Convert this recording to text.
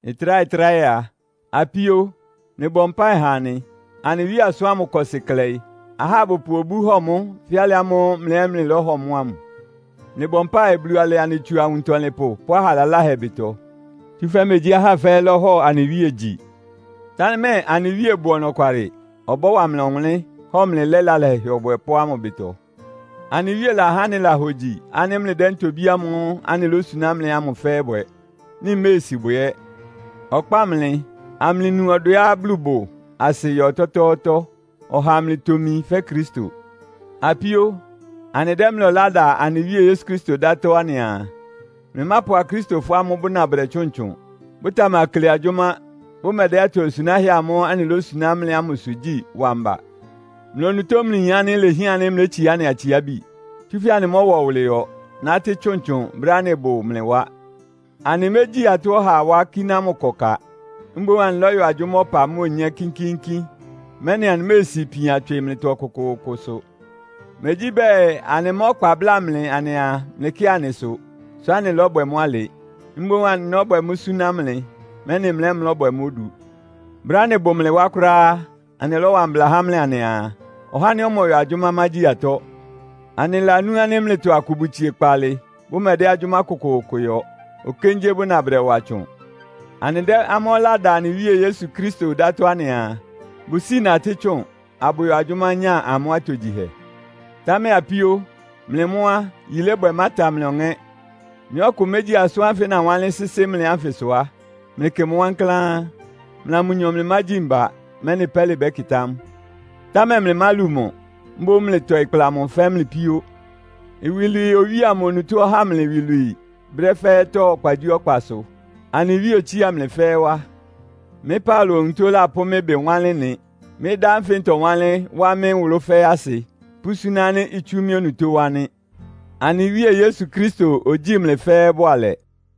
Ɩtráhɛ-tráhɛ a, apíó, mlɩbɔ mpáɩ ha anɩ. Anɩ Wíe asʋ́n ámʋ ɩkɔ́sɩ klɛɩ. Ahá abʋpʋ obú hɔ mʋ́ fɛ́ alɩ ámʋ́ʋ́ mlɩ ɛ́ mlɩlɔ́hɔ mʋ́ ámʋ. Mlɩbɔ mpáɩ, Bulu ɔlɛ anɩ tsu awuntɔlɩnpʋ pʋ́ aha laláhɛ ɩbɩtɔ. Tsúfɛ́ megyí ahá fɛ́ɛ́ lɔ́hɔ anɩ Wíe gyi. Támɛ anɩ Wíe bʋ ɔnɔkwalɩ. Ɔbɔ́wa mlɩ ɔwʋnlɩ́n, hɔ mlɩ lɛ́ lalahɛ Ɔbwɛpʋ́ ámʋ ɩbɩtɔ. Anɩ Wíe lahá anɩlahogyi ánɩ́ mlɩdɛ́ ntobí ámʋ́ʋ́ anɩlósuná mlɩ ámʋ fɛ́ɛ́ bwɛ, mlɩméesi bwɛ ɛ́. Ɔkpáa mlɩ, amlɩnu ɔdwɛá Bulu bʋ asɩ yɔ ɔtɔ́tɔ́ɔ́tɔ́, ɔha amlɩtomi fɛ́ Kristo. Apíó, anɩdɛ́ mlɩ ɔlá da anɩ Wíe Yesu Kristo ɩdátɔ́ anɩaa, mlɩmápʋ Akristofɔ ámʋ́ʋ́ bʋna bʋdɛtsʋ́ʋn, bʋtamakle agyʋ́má, bʋmɛdɛ́ atosunáhɛ́ amʋ́ʋ́ anɩlósuná mlɩ ámʋsʋ gyí wa mba. Mlɩ onutó mlɩyin ánɩ́ ilehián ánɩ́ mlétsiá anɩ atsiábi. Tsúfɛ́ anɩmɔ́wa ɔwʋlɩyɔ, nátɩ́ tsʋntsʋn brɛ́á anɩbʋ mlɩ wá. Anɩmégyi atɔ́ ɔhaa wá, kíná mʋ́ ɩkɔ ka. Mboún anɩlɔ́yɔ agyʋ́má ɔpa mʋ́a onyé kínkíínkín, mɛ́nɩ anɩméesi ipian tswɩ mlɩtɔ ɔkʋkʋʋkʋsʋ. Megyí bɛɛ, anɩmá ɔkpa bláa mlɩ anɩaa, mlɩkɩ́ɩ anɩsʋ, sʋ́ anɩlɔ́bwɛ mʋ́ alɩ. Mboún anɩlɔ́bwɛ mʋ́ súná mlɩ, mɛ́nɩ mlɩ ɛ́ mlɔ́bwɛ mʋ́ odu. Brɛ́á anɩbʋ mlɩ wá kʋ́ráá á, anɩlɔ́wa mbla há mlɩ anɩaa, “Ɔhá ánɩ́ ɔmɔyɔ agyʋ́má mágyi atɔ́.” Anɩlanú ánɩ́ mlɩtɔ akʋ bʋtsie kpaalɩ, bʋmɛdɛ́ agyʋ́má kʋkʋʋkʋ yɔ. Okéngyé bʋna bʋdɛwa tsʋn. Anɩdɛ́ amʋ́ ɔlá da anɩ Wíe Yesu Kristo ɩdátɔ́ anɩaa, bʋsíi natɩ́ tsʋn, abʋyɔ agyʋ́má nya amʋ́ atogyihɛ. Támɛ apíó, mlɩ mʋ́ á, yilébwɛ ɩmáta mlɩ ɔŋɛ́. Nɩ́ ɔkʋ mégyi asʋ́n ánfɩ anɩlawánlɩ́n sɩ́sɩ́ mlɩ ánfɩsʋ á, mlɩkɩ mʋ wankláán. Mlɩa mʋnyɔ mlɩmágyi mba, mɛ́nɩ pɛ́lɩ bɛ́kɩtá mʋ. Támɛ mlɩmálu mʋ, mboún mlɩtɔɩ kpla mʋ fɛ́ mlɩ píó. Iwilwii Owíe amʋ onutó ɔhá mlɩ iwilwii brɛ́ fɛ́ɛ́tɔ́ ɔkpagyíɔkpasʋ. Anɩ Wíe otsía mlɩ fɛ́ɛ́ wá. Mɩ́ Paulo onutó lapʋ́ mɩ́ ɩbɩ wanlɩ́n ɩ́nɩ. Mɩ́ dá ánfɩ ntɔwánlɩ́n wá mɩ́ nwʋlʋ́ fɛ́ɛ́ asɩ, pʋ́súná ánɩ́ itsú mɩ́ onutó wá nɩ́. Anɩ Wíe Yesu Kristo ogyíi mlɩ fɛ́ɛ́ bʋalɛ.